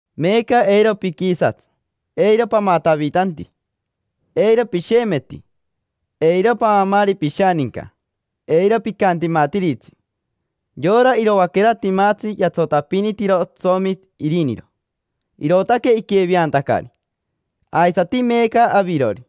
Meeca eiro piquisatsi, eiro pamatavitanti, eiro pishemeti, eiro paamaari pishaninca, eiro picantimatiritsi. Yora iroaquera timatsi yatsotapinitiro otsomi iriniro, irootaque iqueveantacari. Aisati meeca avirori,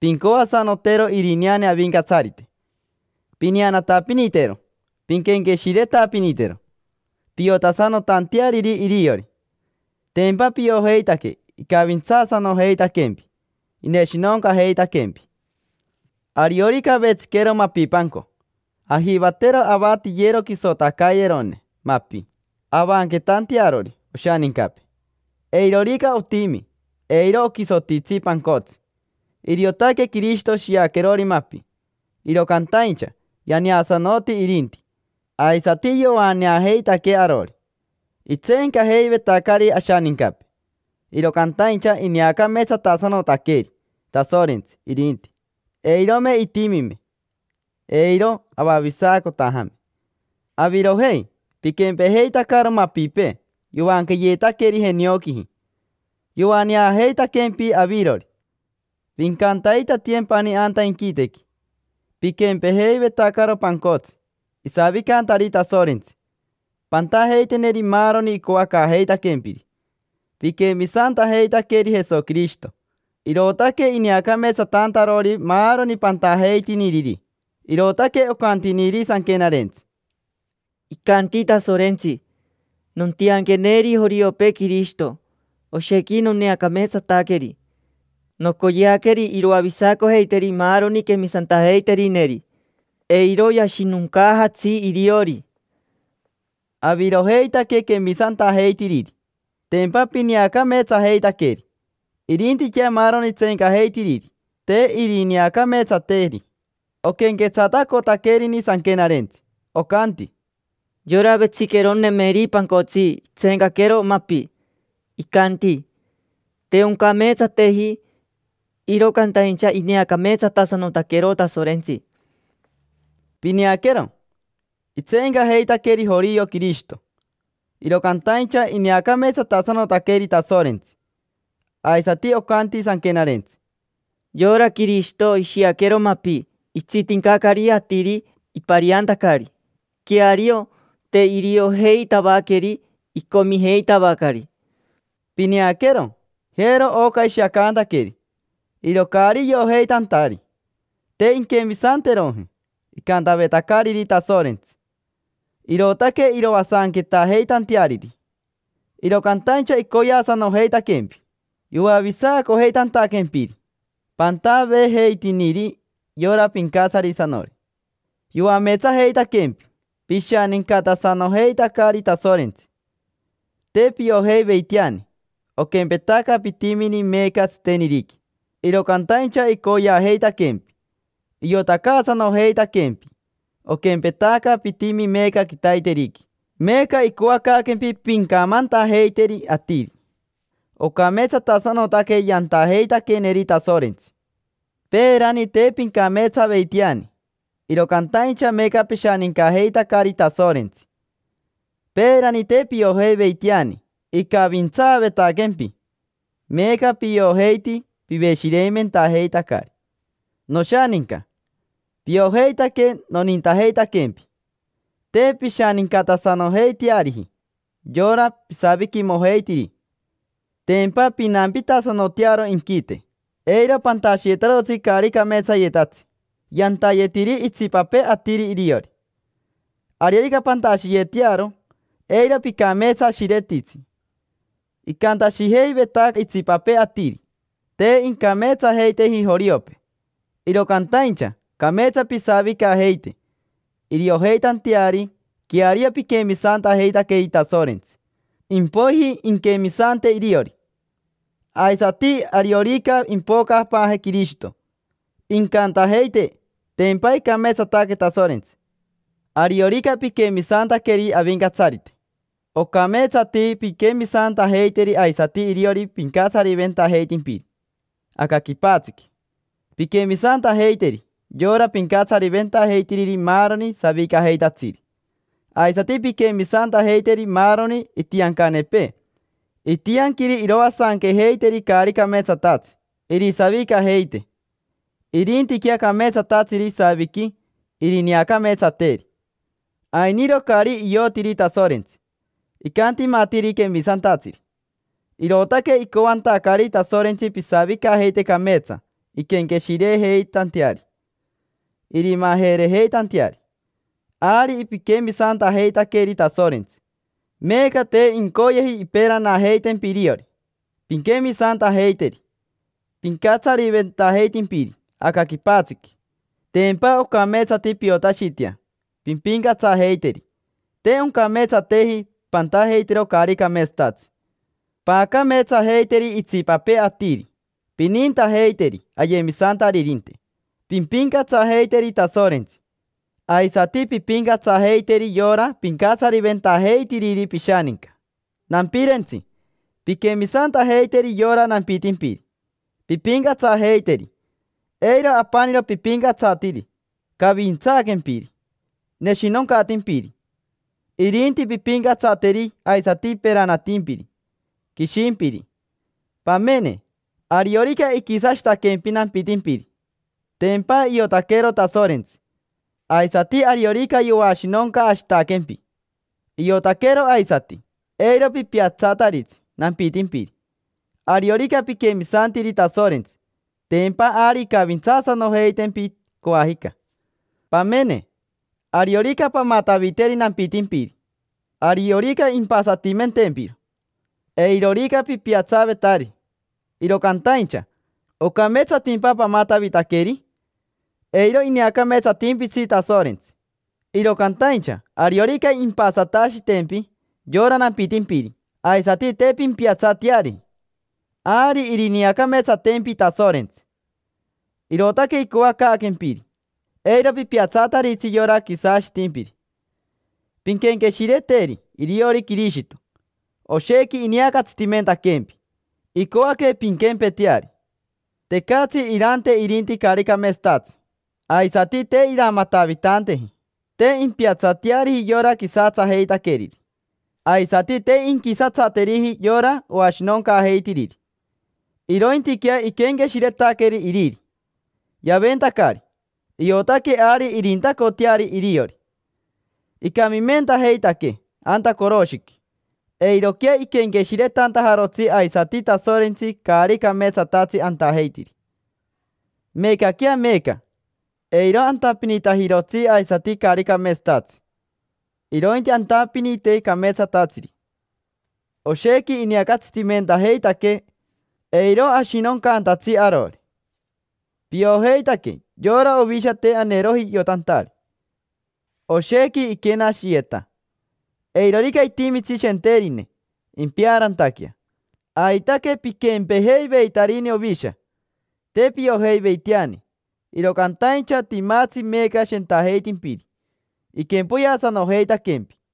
pincoasanotero irineane Avincatsarite: pineanatapinitero, pinquenqueshiretapinitero, piotasanotanteariri iriori. Tempa piojeitaque icavintsaasanojeitaquempi, ineshinoncajeitaquempi. Ariorica avetsiquero mapipanco, ajivatero avatiyero quisotacayerone mapi avanquetantearori oshanincapee. Eirorica otimi, eiro oquisotitsi pancotsi. Iriotaque Quirishito shiaquerori mapi, iro cantaincha yaneasanoti irinti, aisati yoaneajeitaquee arori. Itseencajeivetacari ashanincapee, iro cantaincha ineacameetsatasanotaqueri Tasorentsi irinti. Eirome itimime, eiro avavisacotajame. Avirojei, piquempejeitacaro mapipee yoanqueyeetaqueri jenioquiji. Yoaneajeitaquempi avirori, pincantaitatiyempani anta inquitequi. Piquempejeivetacaro pancotsi, isavicantari Tasorentsi; pantajeiteneri maaroni icoacaajeitaquempiri. Piquemisantajeitaqueri Jesoquirishito, irootaque ineacameetsatantarori maaroni pantajeitiniriri. Irootaque ocantiniri Sanquenarentsi: “Icanti Tasorentsi: ‘Nontianqueneri joriopee Quirishito, oshequi noneacameetsataqueri. Nocoyeaqueri iroavisacojeiteri maaroni quemisantajeiterineri, eiro yashinoncaajatsi iriori’”. Avirojeitaque quemisantajeitiriri, tempa pineacameetsajeitaqueri. Irintiquea maaroni tseencajeitiriri, te irineacameetsateri. Oquenquetsatacotaquerini Sanquenarentsi, ocanti: “Yora vetsiqueronemeri pancotsi itseencaquero mapi, icanti: ‘Te oncameetsateji’. Iro cantaincha ineacameetsatasanotaquero Tasorentsi.” Pineaquero, itseencajeitaqueri jorio Quirishito, iro cantaincha ineacameetsatasanotaqueri Tasorentsi. Aisati ocanti Sanquenarentsi: “Yora Quirishito ishiaquero mapi itsitincacari atiri ipariantacari. Queario, te iriojeitavaqueri, icomijeitavacari”. Pineaquero, jero oca ishiacantaqueri: iro caari iojeitantari, te inquemisanteroji icantavetacariri Tasorentsi, irootaque iroasanquetaajeitanteariri. Iro cantaincha icoyeasanojeitaquempi yoavisacojeitantaquempiri. Pantaveejeitiniri yora Pincatsarisanori. Yoameetsajeitaquempi, pishanincatasanojeitacari Tasorentsi. Te piojeiveiteani, oquempetaca pitimini meeca tsiteniriqui; iro cantaincha icoyeajeitaquempi, iotacaasanojeitaquempi, oquempetaca pitimi meeca quitaiteriqui. Meeca icoacaaquempi pincamantajeiteri atiri: “Ocameetsatasanotaque yantajeitaqueeneri Tasorentsi”. Peerani te pincameetsaveiteani, iro cantaincha meeca pishanincajeitacari Tasorentsi. Peerani te piojeiveiteani icavintsaavetaquempi, meeca piojeiti, piveshireimentajeitacari. Noshaninca, piojeitaque nonintajeitaquempi. Te pishanincatasanojeiteariji yora pisaviquimojeitiri, tempa pinampitasanotearo inquite. Eiro pantashiyetarotsi caari cameetsayetatsi yantayetiri itsipapee atiri iriori. Ariorica pantashiyetearo, eiro picameetsashiretitsi. Icantashijeiveta itsipapee atiri: “Te incameetsajeiteji joriopee”, iro cantaincha cameetsa pisavicajeite, iriojeitanteari queario piquemisantajeitaqueri Tasorentsi. Impoiji inquemisante iriori, aisati ariorica impocapaaje Quirishito, incantajeite: “Tempa icameetsataque Tasorentsi”. Ariorica piquemisantaqueri Avincatsarite, ocameetsati pinquemisantajeiteri aisati iriori pincatsariventajeitimpiri aca quipatsiqui. Pinquemisantajeiteri yora pincatsariventajeitiriri maaroni savicajeitatsiri, aisati pinquemisantajeiteri maaroni itiancanepee. Itianquiri iroasanquejeiteri caari cameetsatatsi irisavicajeite. Irintiquea cameetsatatsiri isaviqui irineacameetsateri. Ainiro caari iotiri Tasorentsi, icantimatiri quemisantatsiri. Irootaque icoantacari Tasorentsi pisavicajeite cameetsa inquenqueshirejeitanteari, irimajerejeitanteari. Ari piquemisantajeitaqueri Tasorentsi, meeca te incoyeji imperanajeitempi iriori pinquemisantajeiteri pincatsariventajeitimpiri aca quipatsiqui, tempa ocameetsati piotashitea pimpincatsajeiteri. Te oncameetsateji pantajeitero caari cameetsatatsi. Paacameetsajeiteri itsipapee atiri, pinintajeiteri ayemisantaririnte, pimpincatsajeiteri Tasorentsi, aisati pimpincatsajeiteri yora pincatsariventajeitiriri pishaninca. Nampirentsi, pinquemisantajeiteri yora nampitimpiri, pimpincatsajeiteri. Eiro apaniro pipincatsatiri cavintsaaquempiri, neshinoncatimpiri; irinti pimpincatsateri aisati peranatimpiri, quishimpiri. Pamene, ariorica iquisashitaquempi nampitimpiri, tempa iotaquero Tasorentsi; aisati ariorica yoashinoncashitaquempi, iotaquero aisati. Eiro pipiatsataritsi nampitimpiri. Ariorica piquemisantiri Tasorentsi, tempa ari incavintsaasanojeitempi coajica. Pamene, ariorica pamataviteri nampitimpiri, ariorica impasatimentempiro. Eirorica pipiatsavetari, iro cantaincha ¿ocameetsatimpa pamatavitaqueri? Eiro ineacameetsatimpitsi Tasorentsi. Iro cantaincha ariorica impasatashitempi yora nampitimpiri aisati te pimpiatsateari, ari irineacameetsatempi Tasorentsi. Irootaque icoacaaquempiri: eiro pipiatsataritsi yora quisashitimpiri. Pinquenqueshireteri iriori Quirishito: oshequi ineacatsitimentaquempi, icoaque pinquempeteari. Tecatsi irante irinti caari cameetsatatsi, aisati te iramatavitanteji. Te impiatsateariji yora quisatsajeitaqueriri, aisati te inquisatsateriji yora oashinoncaajeitiriri. Irointiquea iquenqueshiretaqueri iriri, yaventacari, iotaque ari irintacoteari iriori. Icamimentajeitaquee anta coroshiqui, eiroquea iquenqueshiretantajarotsi aisati Tasorentsi caari cameetsatatsi antajeitiri. Meecaquea meeca, eiro antapinitajirotsi aisati caari cameetsatatsi, irointi antapinite cameetsatatsiri. Oshequi ineacatsitimentajeitaquee, eiro ashinoncantatsi arori. Piojeitaque yora ovisha te aneeroji iotantari: oshequi iquenashiyeta. Eirorica itimitsi shenterine impeaarantaquea. Aitaque piquempejeiveitarini ovisha, te piojeiveiteani. Iro cantaincha timatsi meeca Shentajeitimpiri, iquempoyeasanojeitaquempi.